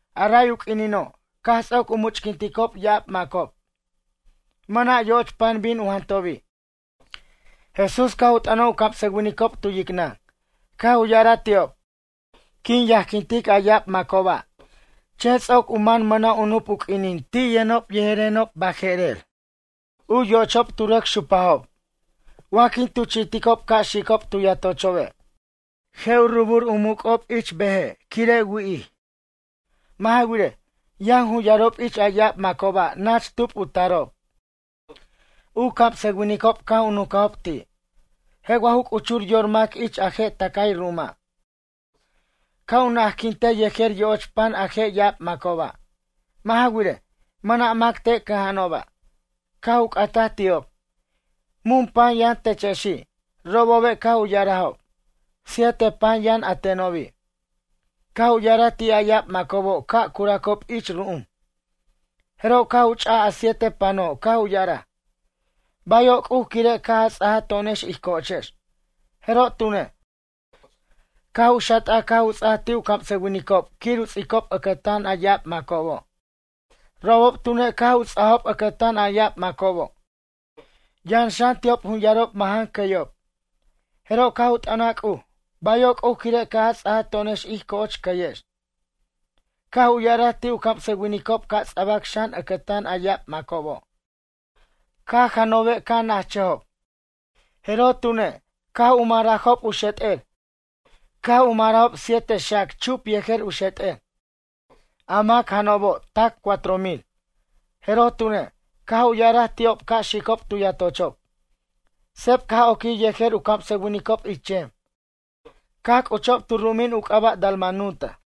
A ray u q'uinino', caj ts'oc u much'quinticob ya'ab macob. Mʌna' yo'och pan bin u jantobi'. Jesús caj u t'ʌnaj u camsʌwinicob tu yicnʌn, caj u ya'araj ti'ob: ―Quin yajquintic a ya'ab macoba' chen ts'oc u man mʌna' u nup u q'uinin ti' yʌnob yejerenob baje'rer, u yo'ochob tu rʌc xupajob. Wa quin tuchi'ticob ca' xicob tu yatochobe' je' u rubur u muc'ob ich beje' quire' wi'ij. Mʌ' ja wirej, yʌn jun yarob ich a ya'ab macoba' nach tub u tarob. U camsʌwinicob caj u nuncajob ti': ―Je' wa ju c'uchur yor mac ich a je' tʌcay ru'uma' ca' u na'ajquintej yejer yo'och pan a je' ya'ab macoba'? Mʌ' ja wirej, mʌna' mac te' cʌja'anoba'. Caj u c'ataj ti'ob: ―Mun pan yʌn techexi'? Robobe' caj u ya'arajob: ―Siete pan yʌn a tenobi'. Caj u ya'araj ti' a ya'ab macobo' ca' curacob ich ru'um. Jeroj caj u ch'aj a siete pano' caj u ya'araj: “Bayo' C'uj quire' caj a ts'aj to'onex ij co'ochex”, jeroj tune', caj u xat'aj caj u ts'aj ti' u camsʌwinicob quir u ts'icob ʌcʌtan a ya'ab macobo'. Robob tune' caj u ts'ajob ʌcʌtan a ya'ab macobo'. Yʌn xan ti'ob jun yarob majʌn cʌyob, jeroj caj u t'ʌnaj C'uj: “Bayo' C'uj quire' caj a ts'aj to'onex ij co'och cʌyex”, caj u ya'araj ti' u camsʌwinicob ca' ts'abac xan ʌcʌtan a ya'ab macobo'. Caj janobe' caj na'ajchʌjob, jeroj tune', caj u marajob u xet'er, caj u marajob siete xac chup yejer u xet'er. A mac janobo' tac cuatro mil. Jeroj tune', caj u ya'araj ti'ob ca' xicob tu yatochob. Seb caj oquij yejer u camsʌwinicob ich chem, caj c'uchob tu ru'umin u c'aba' Dalmanuta.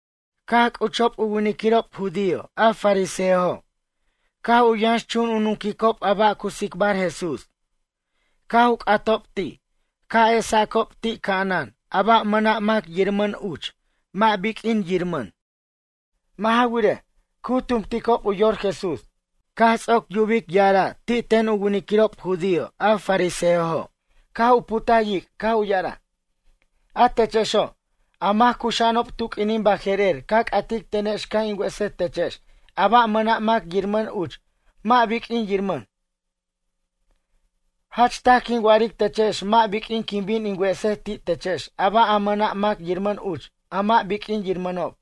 Caj c'uchob a winiquirob judío a fariseojo' caj yʌnxchun u nunquicob a ba' cu tsicbar Jesús, caj u c'atob ti' u esacob ti' ca'anan a ba' mʌna' mac yiramʌn uch mʌ' biq'uin yiramʌn. Mʌ' ja wirej, cu tumticob u yor Jesús. Caj ts'oc yubic ya'ara' ti' ten u winiquirob judío a fariseojo' caj u putaj yic', caj u ya'araj: ―A techexo', a mac cuxa'anob tu q'uinin baje'rer ca c'atic tenex ca' in wesej techex a ba' a mʌna' mac yiramʌn uch mʌ' biq'uin yiramʌn. Jach taj quin wa'aric techex mʌ' biq'uin quin bin in wesej ti' techex a ba' a mʌna' mac yiramʌn uch a mʌ' biq'uin yiramʌno'.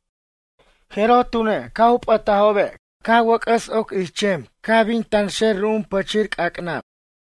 Jeroj tune', caj u p'ʌtajobe', caj wʌc'ʌs oc ich chem caj bin tanxer ru'um pichir c'ac'nab.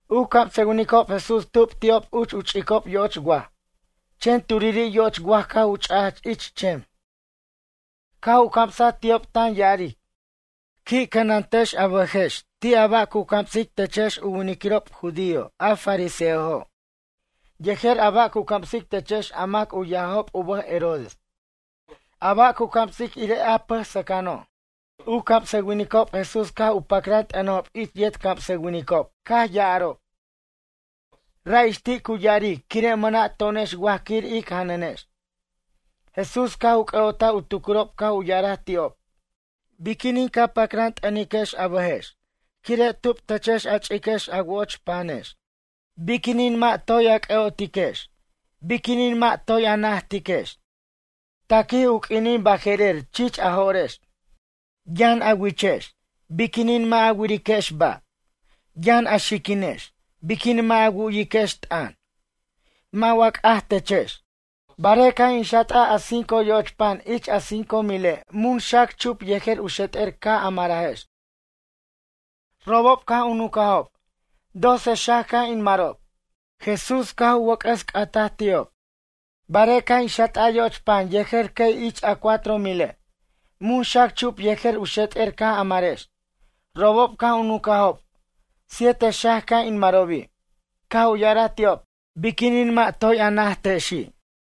U camsʌwinicob Jesús tu'ub ti'ob uch u ch'icob yo'och waj, Chen turiri' yo'och waj caj u ch'aj ich chem. Caj u camsaj ti'ob tan ya'aric: ―Qui' cʌnantechex a bʌjex ti' a ba' cu camsic techex u winiquirob judío a fariseojo' yejer a ba' cu camsic techex a mac u yajob u bʌj Herodes. A ba' cu camsicob irej a pʌj sʌcʌno'. U camsʌwinicob Jesús caj u pacran t'ʌnajob ich u yet camsʌwinicob caj ya'arob: ―Ra' ix ti' cu ya'aric quire' mʌna' to'onex waj quir ic janʌnex. Jesús caj u c'ʌ'otaj u tucurob caj u ya'araj ti'ob: ―Biquinin ca pacran t'ʌniquex a bʌjex quire' tub techex a ch'iquex a wo'och panex? Biquinin mʌ' a toy c'ʌ'otiquex biquinin mʌ' a toy najtiquex? Taquij u q'uinin baje'rer chich a jo'rex. Yʌn a wichex biqinin mʌ' a wiriquex ba'? Yʌn a xiquinex biquinin mʌ' a wu'yiquex t'ʌn? Mʌ' wa c'aj techex? Barej caj in xat'aj a cinco yo'och pan ich a cinco mile' mun xac chup yejer u xet'er caj a marajex? Robob caj u nuncajob: ―Doce xac caj in marob. Jesús caj u wʌc'ʌs c'ataj ti'ob: ―Barej caj in xat'aj yo'och pan yejer cʌy ich a cuatro mile', mun xac chup yejer u xet'er caj a marex? Robob caj u nuncajob: ―Siete xac caj in marobi'. Caj u ya'araj ti'ob: ―Biquinin mʌ' toy a najtajexi'?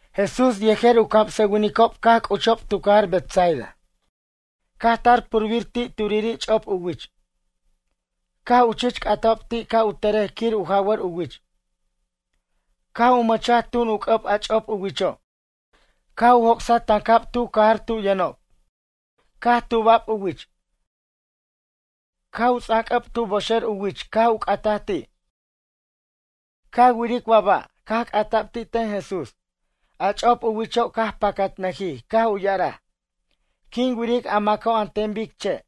Jesús yejer u camsʌwincob caj c'uchob tu cajar Betsaida. Caj tar purbir ti' turiri' ch'op u wich, caj u chich c'atajob ti' ca' u tʌrej quir u jawʌr u wich. Caj u mʌchaj tun u c'ʌb a chop u wicho' caj u joc'saj tancab tu cajar tu yʌnob. Caj tuba'b u wich, caj u ts'an c'ʌb tu boxer u wich caj u c'ataj ti': ―Ca wiric wa ba'? ―caj c'ata'b ti' ten Jesús. A ch'op u wicho' caj pacatnʌjij caj u ya'araj: ―Quin wiric a maco' an ten bic che',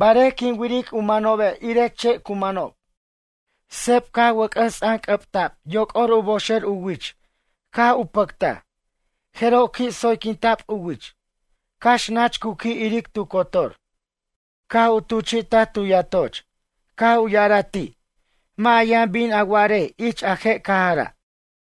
barej quin wiric u manobe' irej che' cu manob. Seb wʌc'ʌs ts'anc'ʌbtaj yoc'or u boxer wich caj u pacat, jeroj qui' tsoyquinta'b u wich, cax nach cu qui' yiric tu cotor. Caj u tuchi'taj u yatoch, caj u ya'araj ti': ―Mʌ' a yʌn bin a wa'arej ich a je' cajara'.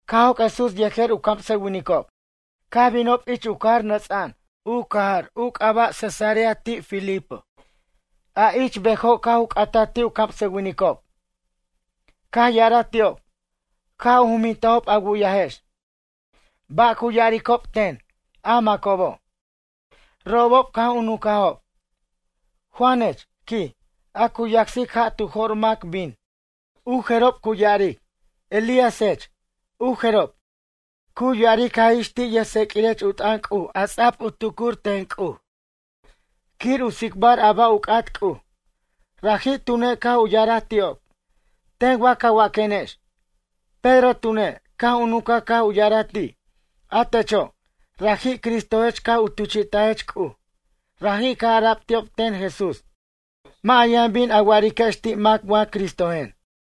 Caj joc' Jesús yejer u camsʌwinicob, caj binob ich u cajarob nʌts'a'an, u cajar u c'aba' Cesarea Filipo. A ich bejo' caj u c'ataj ti' u camsʌwinicob, caj ya'araj ti'ob: ―Caj u jumintajob a wu'yajex, ba' cu ya'aricob ten, a macobo'? Robob caj u nuncajob: ―Juanech ―quij―, a cu yacsic ja' tu jo'r mac bin. U jerob cu ya'aric, Elíasech. U jerob, cu ya'aric jaj ix ti' yʌjtseq'uirech u t'ʌn C'uj a ts'a'b u tucuric ten C'uj quir u tsicbar a ba' u c'at C'uj. Raji' tune' caj u ya'araj ti'ob: ―Ten wa ca waquenex? Pedro tune', caj u nuncaj caj u ya'araj ti': ―A techo', raji' Cristojech caj u tuchi'tajech C'uj. Raji' caj ara'b ti'ob ten Jesús: ―Mʌ' a yʌn bin a wa'ariquex ti' mac wa Cristojen.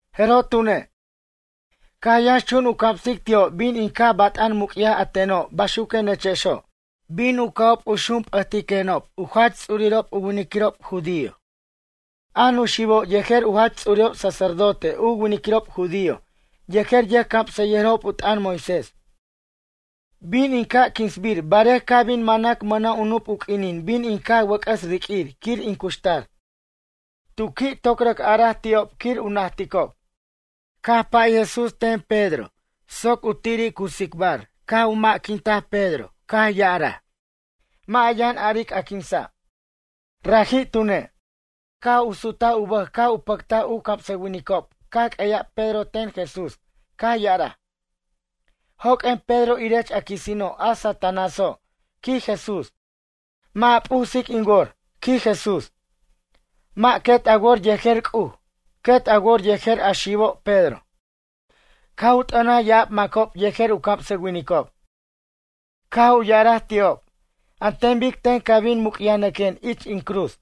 Jeroj tune', caj yʌnxchun u camsic ti'ob bin in caj bat'an muc'yaj a teno' baxuquenechexo'. Bin u ca'ob u xurp'ʌtiquenob u jach ts'urirob u winiquirob judío, a nuxibo' yejer u jach ts'urirob sacerdote u winiquirob judío yejer yʌjcamsʌyʌjirob u t'ʌn Moisés. Bin in caj quinsbir barej ca' bin manac mʌna' u nup u q'uinin bin in caj wʌc'ʌs riq'uir quir in cuxtar. Tu qui' toc rʌc araj ti'ob quir u najticob. Caj pay Jesús ten Pedro soc u tiri' cu tsicbar caj u majquintaj Pedro caj ya'araj: ―Mʌ' a yʌn aric a quinsa'. Raji' tune', caj u sutaj u bʌj caj u pʌctaj u camsʌwinicob caj q'ueya'b Pedro ten Jesús caj ya'araj: ―Joq'uen Pedro irech a quisino' a Satanáso' ―quij Jesús―. Mʌ' a p'usic in wor ―quij Jesús―. Mʌ' quet a wor yejer C'uj, quet a wor yejer a xibo' Pedro. Caj u t'ʌnaj ya'ab macob yejer u camsʌwinicob, caj u ya'araj ti'ob: ―An ten bic ten ca' bin muc'yajnʌquen ich in cruz.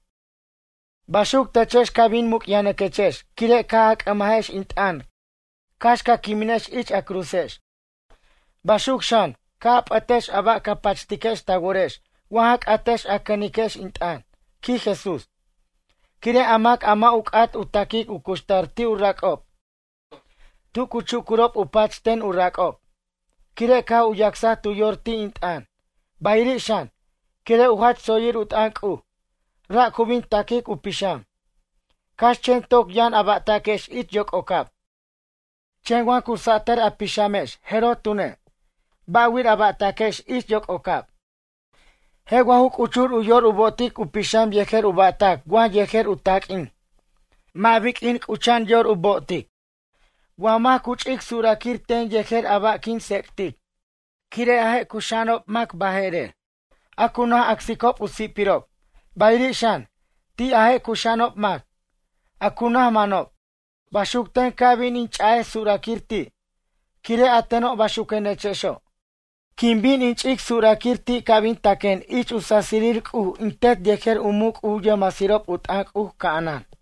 Baxuc techex ca' bin muc'yajnʌquechex quire' caj a c'ʌmajex in t'ʌn cax ca quiminex ich a cruzex. Baxuc xan, ca' a p'ʌtex a ba' ca pachtiquex ta worex wa ja c'atex a cʌniquex in t'ʌn ―quij Jesús―. Quire' a mac a mʌ' u c'at u taquic u cuxtar ti' u rac'ob tu cu chucurob u pach ten u rac'ob, quire' caj u yacsaj tu yor ti' in t'ʌn, bayiri' xan, quire' u jach tsoyir u t'ʌn C'uj, ra' cu bin taquic u pixam. Cax chen toc yʌn a ba'taquex ich yoc'ocab chen wa cu sa'tar a pixamex jeroj tune', ba' wir a ba'taquex ich yoc'ocab? Je' wa ju c'uchur u yor u bo'otic u pixam yejer u ba'tac wa yejer u taq'uin? Mʌ' biq'uini', c'ucha'an yor u bo'otic. Wa mac cu ch'ic suraquir ten yejer a ba' quin tsec'tic, quire' a je' cuxa'anob mac baje'rer, a cu naj acsicob u si'pirob, bayiri' xan, ti' a je' cuxa'anob mac, a cu naj manob, baxuc ten ca' bin in ch'a'ej suraquir ti', quire' a teno' baxuquenechexo'. Quin bin in ch'ic suraquir ti' ca' bin taquen ich u sasirir C'uj in Tet yejer u muc' u yʌjmasirob u t'ʌn C'uj ca'anan.